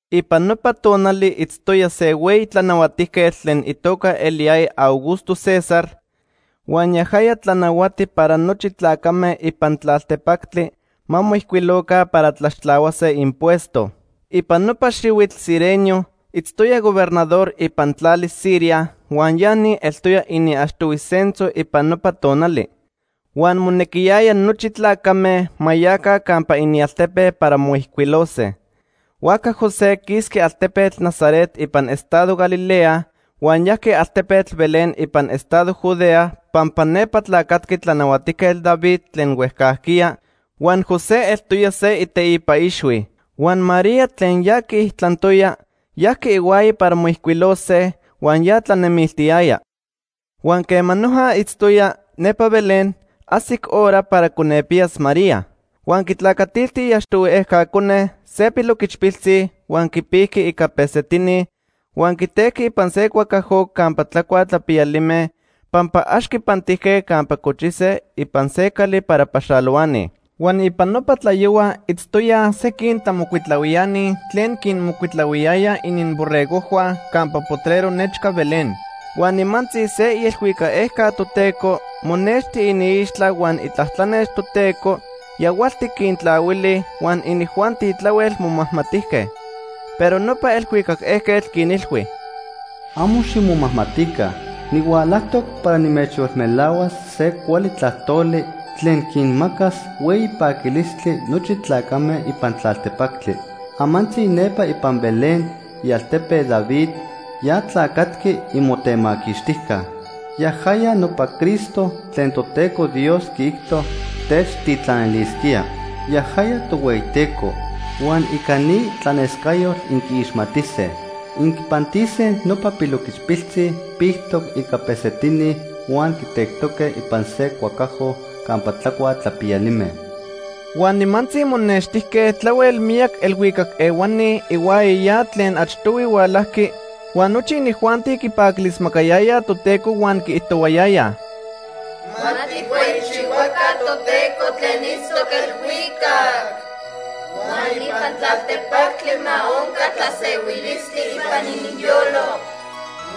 Ipan nopa tonali itztoya se hueyi tlanahuatijquetl tlen itoca eliyaya Augusto César huan yajaya tlanahuati para nochi tlacame ipan tlaltepactli ma moijcuiloca para tlaxtlahuase impuesto. Ipan nopa xihuitl Cirenio itztoya gobernador ipan tlali Siria huan ya ni eltoya iniachtohui censo ipan nopa tonali. Huan monequiyaya nochi tlacame ma yaca campa inialtepe para moijcuilose. Huajca José quisqui altepetl Nazaret ipan estado Galilea huan yajqui altepetl Belén ipan estado Judea pampa nepa tlacatqui Tlanahuatijquetl David tlen huejcajquiya huan José eltoya se iteipa ixhui. Huan María, tlen ya quiijtlantoya, yajqui ihuaya para moijcuilose, huan ya tlanemiltiyaya. Huan quema noja itztoyaj nepa Belén, ajsic hora para conepiyas María. Huan quitlacatilti iachtohui ejca cone, se piloquichpiltzi huan quipijqui ica pesetini huan quitejqui ipan se cuacajo campa tlacuaj tlapiyalime pampa ax quipantijque campa cochise ipan se cali para paxalohuani. Huan ipan nopa tlayohua itztoyaj sequin tlamocuitlahuiani tlen quinmocuitlahuiyayaj ininborregojhua campa potrero nechca Belén. Huan nimantzi se ielhuicac ejca Toteco monexti iniixtla huan itlatlanex Toteco yahualtic quintlahuili huan inijuanti tlahuel momajmatijque. Pero nopa elhuicac ejquetl quinilhui: “Amo ximomajmatica. Nihualajtoc para nimechyolmelahuas se cuali tlajtoli tlen quinmacas hueyi paquilistli nochi tlacame ipan tlaltepactli. Amantzi nepa ipan Belén, ialtepe David, ya tlacatqui imotemaquixtijca. Yajaya nopa Cristo tlen Toteco Dios quiijto techtitlanilisquía. Yajaya Tohueyiteco. Huan ica ni tlanescayotl inquiixmatise. Inquipantise nopa piloquichpiltzi pictoc ica pesetini huan quitectoque ipan se cuacajo campa tlacuaj tlapiyalime.” Huan nimantzi monextijque tlahuel miyac elhuicac ehuani ihuaya ya tlen achtohui hualajqui, huan nochi inijuanti quipaquilismacayayaj Toteco huan quiijtohuayayaj: “Ma tijhueyichihuaca Toteco tlen itztoc elhuicac. Huan ipan tlaltepactli ma onca tlasehuilistli ipan ininyolo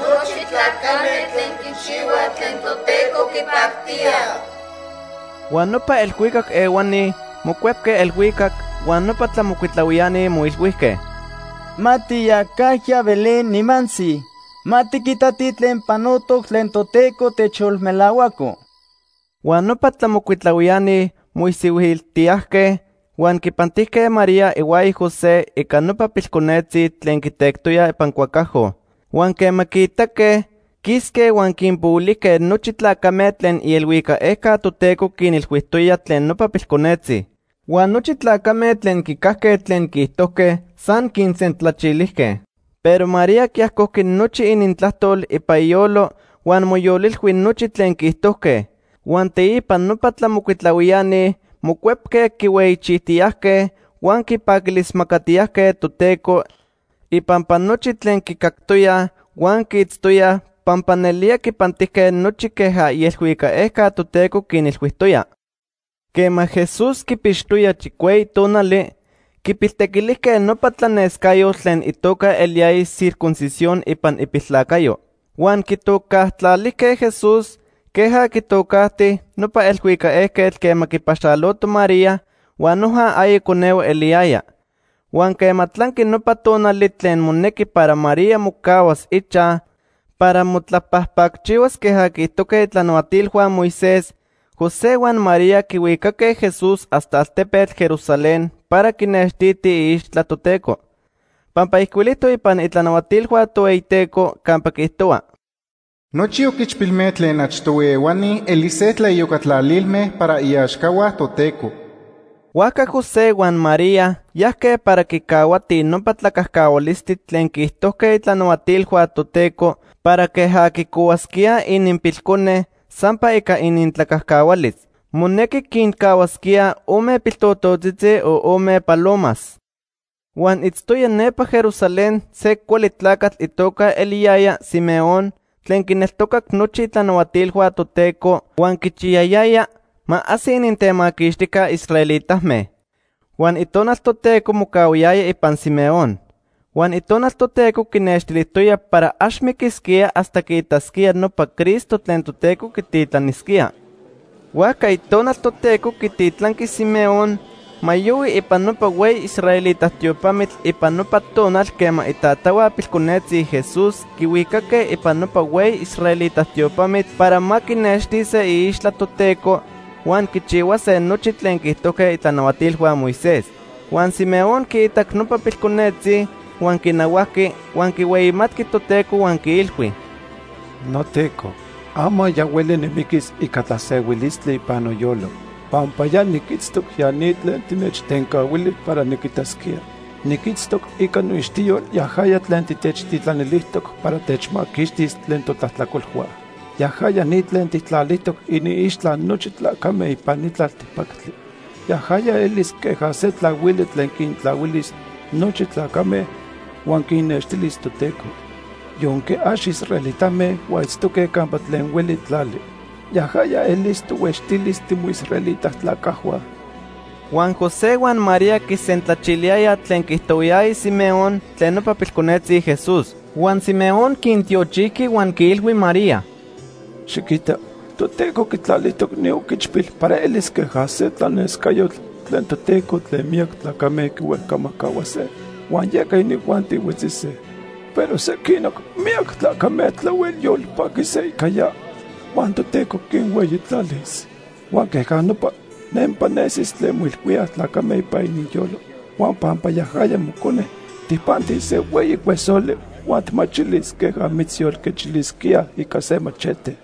nochi tlacame tlen quichihuaj tlen Toteco quipactía.” Huan nopa elhuicac ehuani mocuepque elhuicac, huan nopa tlamocuitlahuiani moilhuijque: ―Ma tiyacajya Belén nimantzi. Ma tiquitatij tlen panotoc tlen Toteco techyolmelahuaco. Huan nopa tlamocuitlahuiani moisihuiltijtiyajque huan quipantijque María ihuaya José ica nopa pilconetzi tlen quitectoyaj ipan cuacajo. Huan quema quiitaque, quisque huan quinpohuilijque nochi tlacame tlen ielhuicac ejca Toteco quinilhuijtoya tlen nopa pilconetzi. Huan nochi tlacame tlen quicajque tlen quiijtojque san quinsentlachilijque. Pero María quiajcojqui nochi inintlajtol ipan iyolo huan moyolilhui nochi tlen quiijtojque. Huan teipa nopa tlamocuitlahuiani mocuepque quihueyichijtiyajque, huan quipaquilismacatiyajque Toteco ipampa nochi tlen quicactoyaj huan quiitztoyaj, pampa nelía quipantijque nochi queja ielhuicac ejca Toteco quinilhuijtoya. Quema Jesús quipixtoya chicueyi tonali, quipiltequilijque nopa tlanescayotl tlen itoca eliyaya circuncisión ipan ipiltlacayo. Huan quitocajtlalijque Jesús queja quitocajti nopa elhuicac ejquetl quema quipaxaloto María huan noja aya conehue eliyaya. Huan quema tlanqui nopa tonali tlen monejqui para María mocahuas ichaj para motlapajpacchihuas queja quiijtojque itlanahuatilhua Moisés, José huan María quihuicaque Jesús hasta altepetl Jerusalén para quinextitij iixtla Toteco. Pampa ijcuilijtoc ipan itlanahuatilhua Tohueyiteco campa quiijtohua: “Nochi oquichpilme tlen achtohui ehuani elise tlaiyocatlalilme para iaxcahua Toteco.” Huajca José huan María yajque para quicahuatij nopa tlacajcahualistli tlen quiijtojque itlanahuatilhua Toteco para queja quicohuasquíaj ininpilcone sampa ica inintlacajcahualis. Monequi quincahuasquíaj ome piltototzitzi o ome palomas. Huan itztoya nepa Jerusalén se cuali tlacatl itoca eliyaya Simeón tlen quinneltocac nochi itlanahuatilhua Toteco huan quichiyayaya ma ajsi inintemaquixtijca israelitame. Huan Itonal Toteco mocahuayaya ipan Simeón. Huan Itonal Toteco quinextilijtoya para ax miquisquía hasta quiitasquía nopa Cristo tlen Toteco quititlanisquía. Huajca Itonal Toteco quititlanqui Simeón ma yohui ipan nopa hueyi israelita tiopamitl ipan nopa tonal quema itatahua pilconetzi Jesús quihuicaque ipan nopa hueyi israelita tiopamitl para ma quinextise iixtla Toteco huan quichihuase nochi tlen quiijtojque itlanahuatilhua Moisés. Huan Simeón quiitac nopa pilconetzi, huan quinahuajqui huan quihueyimatqui Toteco huan quiilhui: “NoTeco, ama ya hueli nimiquis ica tlasehuilistli ipan noyolo, pampa ya niquitztoc ya ni tlen tinechtencahuili para niquitasquía. Niquitztoc ica noixtiyol yajaya tlen titechtitlanilijtoc para techmaquixtis tlen totlajtlacolhua. Yajaya ni tlen tijtlalijtoc iniixtla nochi tlacame ipan ni tlaltepactli. Yajaya elis queja se tlahuili tlen quintlahuilis nochi tlacame huan quinnextilis Toteco, yonque ax israelitame huan itztoque campa tlen hueli tlali. Yajaya elis tohuextilis timoisraelita tlacajhua.” Huan José huan María quisentlachiliyayaj tlen quiijtohuayaya Simeón tlen nopa pilconetzi Jesús. Huan Simeón quintiochijqui huan quiilhui María: ―Xiquita, Toteco quitlalijtoc ni oquichpil para elis queja se tlanescayotl tlen Toteco tlen miyac tlacame quihuejcamajcahuase huan yeca inijuanti huetzise. Pero sequinoc miyac tlacame tlahuel paquise ica ya huan Toteco quinhueyitlalis. Huan queja nopa nempa nesis tlen moilhuíaj tlacame ipan ininyolo. Huan pampa yajaya mocone, tijpantis se hueyi cuesoli huan tijmachilis queja mitzyolquechilisquíaj ica se machete.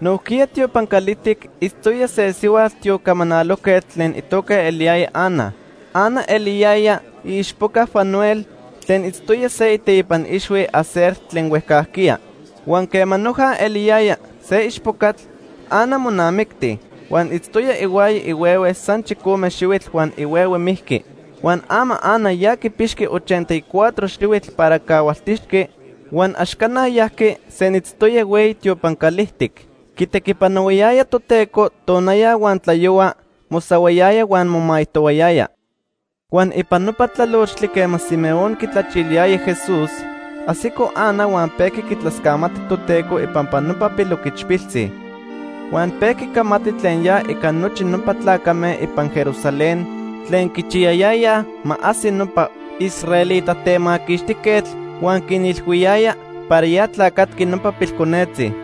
Nojquiya tiopan calijtic itztoya se sihua tiocamanalojquetl tlen itoca eliyaya Ana. Ana eliyaya iichpoca Fanuel, tlen itztoya se iteipa ixhui Aser tlen huejcajquiya. Huan quema noja eliyaya se ichpocatl, Ana monamicti, huan itztoya ihuaya ihuehue san chicome xihuitl huan ihuehue mijqui. Huan ama Ana ya quipixqui ochenta y cuatro xihuitl para cahualtixqui. Huan ax cana yajqui, senitztoya hueyi tiopan calijtic. Quitequipanohuayaya Toteco tonaya huan tlayohua, mosahuayaya huan momaijtoyaya. Huan ipan nopa tlalochtli quema Simeón quitlachiliyaya Jesús, ajsico Ana huan pejqui quitlascamati Toteco ipampa nopa piloquichpiltzi. Huan pejqui camati tlen ya ica nochi nopa tlacame ipan Jerusalén tlen quichiyayayaj ma ajsi nopa israelita Temaquixtijquetl huan quinilhuiyaya para ya tlacatqui nopa pilconetzi.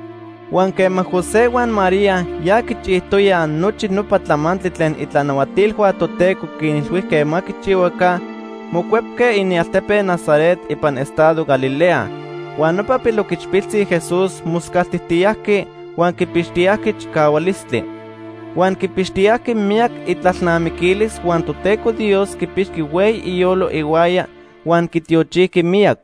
Huan quema José huan María ya quichijtoyaj nochi nopa tlamantli tlen itlanahuatilhua Toteco quinilhuijque ma quichihuaca, mocuepque inialtepe Nazaret ipan estado Galilea. Huan nopa piloquichpiltzi Jesús moscaltijtiyajqui huan quipixtiyajqui chicahualistli. Huan quipixtiyajqui miyac itlalnamiquilis huan Toteco Dios quipixqui hueyi iyolo ihuaya huan quitiochijqui miyac.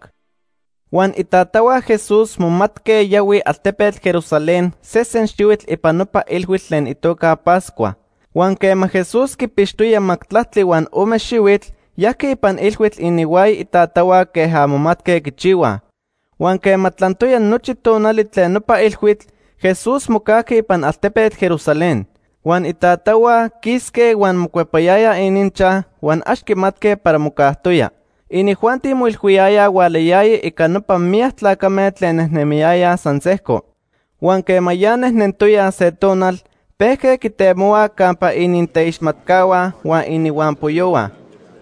Huan itatahua Jesús momatque yahuij altepetl Jerusalén sesen xihuitl ipan nopa ilhuitl tlen itoca Pascua. Huan quema Jesús quipixtoya majtlactli huan ome xihuitl, yajqui ipan ilhuitl ininhuaya itatahua queja momatque quichihuaj. Huan quema tlantoya nochi tonali tlen nopa ilhuitl, Jesús mocajqui ipan altepetl Jerusalén. Huan itatahua quisque huan mocuepayayaj ininchaj huan ax quimatque para mocajtoya. Inijuanti moilhuiyayaj hualayaya ica nopa miyac tlacame tlen nejnemiyayaj san sejco. Huan quema ya nejnentoyaj se tonal, pejque quitemohuaj campa ininteixmatcahua huan ininhuampoyohua,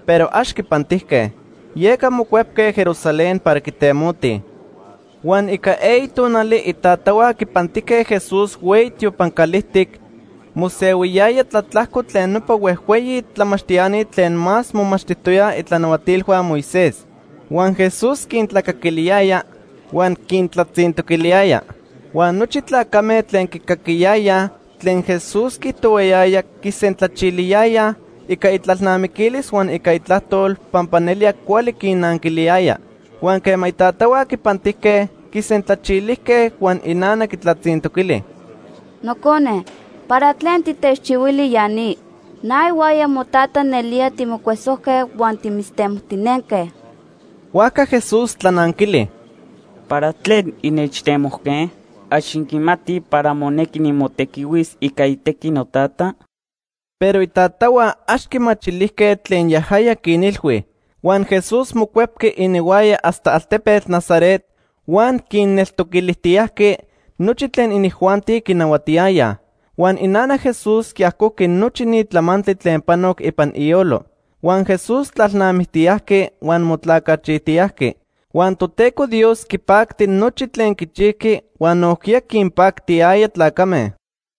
pero ax quipantijque. Yeca mocuepque Jerusalén para quitemotij. Huan ica eyi tonali itatahua quipantijque Jesús hueyi tiopan calijtic, mosehuiyaya tlatlajco tlen nopa huejhueyi tlamachtiani tlen más momachtijtoyaj itlanahuatilhua Moisés. Huan Jesús quintlacaquiliyaya huan quintlatzintoquiliyaya. Huan nochi tlacame tlen quicaquiyayaj tlen Jesús quiijtohuayaya quisentlachiliyayaj ica itlalnamiquilis huan ica itlajtol pampa nelía cuali quinnanquiliyaya. Huan quema itatahua quipantijque, quisentlachilijque. Huan inana quitlatzintoquili: ―Nocone, ¿para tlen titechchihuili ya ni? Na ihuaya motata nelía timocuesojque huan timitztemojtinentoque. Huajca Jesús tlananquili: ―¿Para tlen innechtemojque? ¿Ax inquimatij para monequi nimotequihuis ica itequi Notata? Pero itatahua ax quimachilijque tlen yajaya quinilhui. Huan Jesús mocuepqui ininhuaya hasta altepetl Nazaret, huan quinneltoquilijtiyajqui nochi tlen inijuanti quinahuatiyayaj. Huan inana Jesús quiajcojqui nochi ni tlamantli tlen panoc ipan iyolo. Huan Jesús tlalnamictiyajqui huan motlacachijtiyajqui, huan Toteco Dios quipacti nochi tlen quichijqui huan nojquiya quinpactiyaya tlacame.